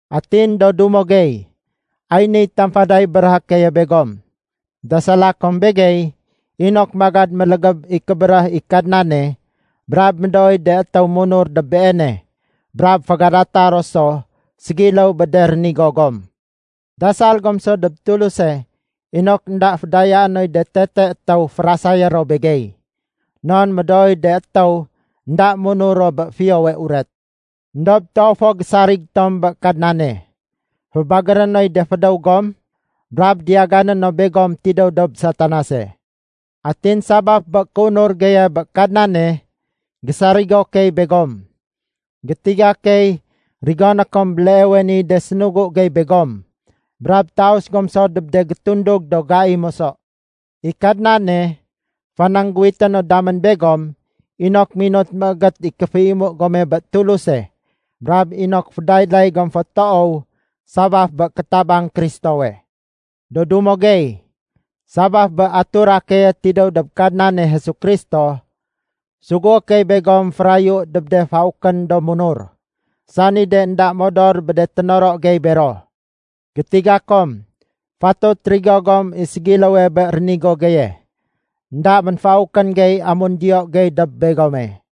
Atin do dumo gey, ay niy tamfaday béréhé keye begom. Dasala kom begey inok magad mélégéb i kébéréh i Kadnane brab médooy de étéw munur dob Beene brab fégadata ro so ségiléw bé de rénigo gom. Dasal gom so dob Tuluse inok énda fédayaé noy de tete étéw férasayé ro begey. Non médooy de étéw énda munur ro bé Fiyowe Uret. Endob toow fo gésarig tom bé Kadnane. Fébagéré noy de fédéw gom brab diyagané no begom tidéw dob Satanase. Atin sabaf bé kéunur geye bé Kadnane, gésarigo key begom. Gétiga key rigoné kom béleewe niy de sénugu gey begom brab taus gom so dob de gétundug do gai moso. I Kadnane fanangguwité no damén begom inok minut méégét i kéféimu gome bé Tuluse brab inok fédayday gom fo toow sabaf bé kétabang Kristowe. Do dumo gey, sabaf bé atura keye tidéw dob Kadnane Jesu Kristo, sugué key begom férayu dob de faukén do munur, sani de énda modor bé de ténoro gey bero. Gétiga kom fatut rigo gom i ségiléwe bé rénigo geye. Enda ménfaukén gey amun diyo gey dob begome.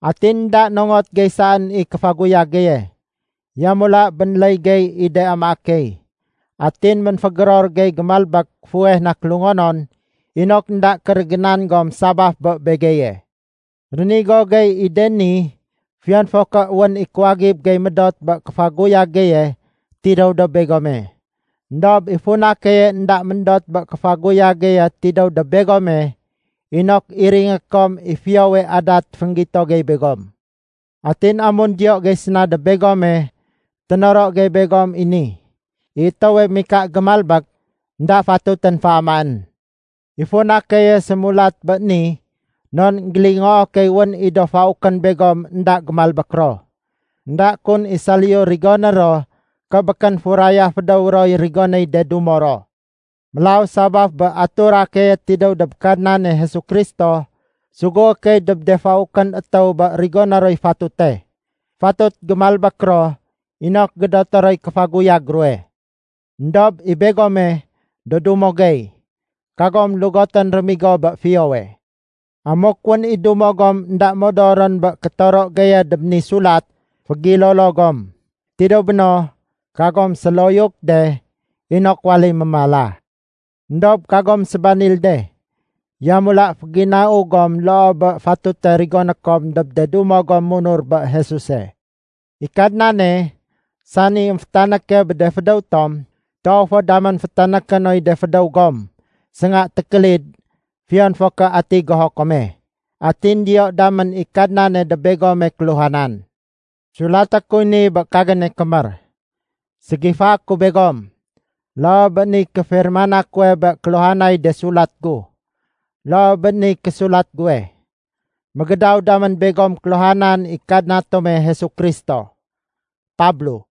Atin énda nongot gey saén i kéfaguyag geye. Yamula bénléy gey i de amaé key. Atin ménfégéror gey gémalbék fuweh na kélungonon inok énda kérégénan gom sabaf bé begeye. Rénigo gey i de ni fiyon fo ké wén i kuwagib gey médot bé kéfaguyag geye tidéw dob begome. Endob i funa keye énda méndot bé kéfaguyag geye tidéw dob begome inok iringé kom i fiyowe adat fénggito gey begom. Atin amun diyo gey séna dob begome, ténoro gey begom i ni: “I étéwe mika gémalbék énda fatutén féamaén.” I funa keye sémulat bé ni non énggélingoo key wén i do faukén begom énda gémalbék ro. Enda kun i saliyu rigoné ro ké békén furaya fédéw roy rigonéy de dumo ro. Mélaw sabaf bé atura keye tidéw dob Kadnane Jesu Kristo, sugué key dob de faukén étéw bé rigoné roy fatute. Fatut gémalbék ro inok gédoté roy kéfaguyag ruwe. Endob i begome, do dumo gey, kagom lugotén rémigo bé fiyowe. Amuk wén i dumo gom énda modorén bé kétoro geye dob ni sulat, fégilolo gom. Tidéw béno, kagom séloyuk de inok waléy mémala. Endob kagom sébanil de, yamula féginau gom loo bé fatute rigoné kom dob de dumo gom munur bé Jesuse. I Kadnane, sani émfétanéke bé de fédéw tom, toow fo damén fétanéké noy de fédéw gom sénga tékélid fiyon fo ké ati goho kome. Atin diyo damén i Kadnane dob begome kéhuhanan. Sulaté kuy ni bé kagéne kémér. Ségifaé ku begom. Loo bé niy kéfirmana kuwe bé kéluhanay de sulat gu. Loo bé niy késulat guwe. Mégédaw damén begom kéluhanan i Kadna tome Jesu Kristo. Pablo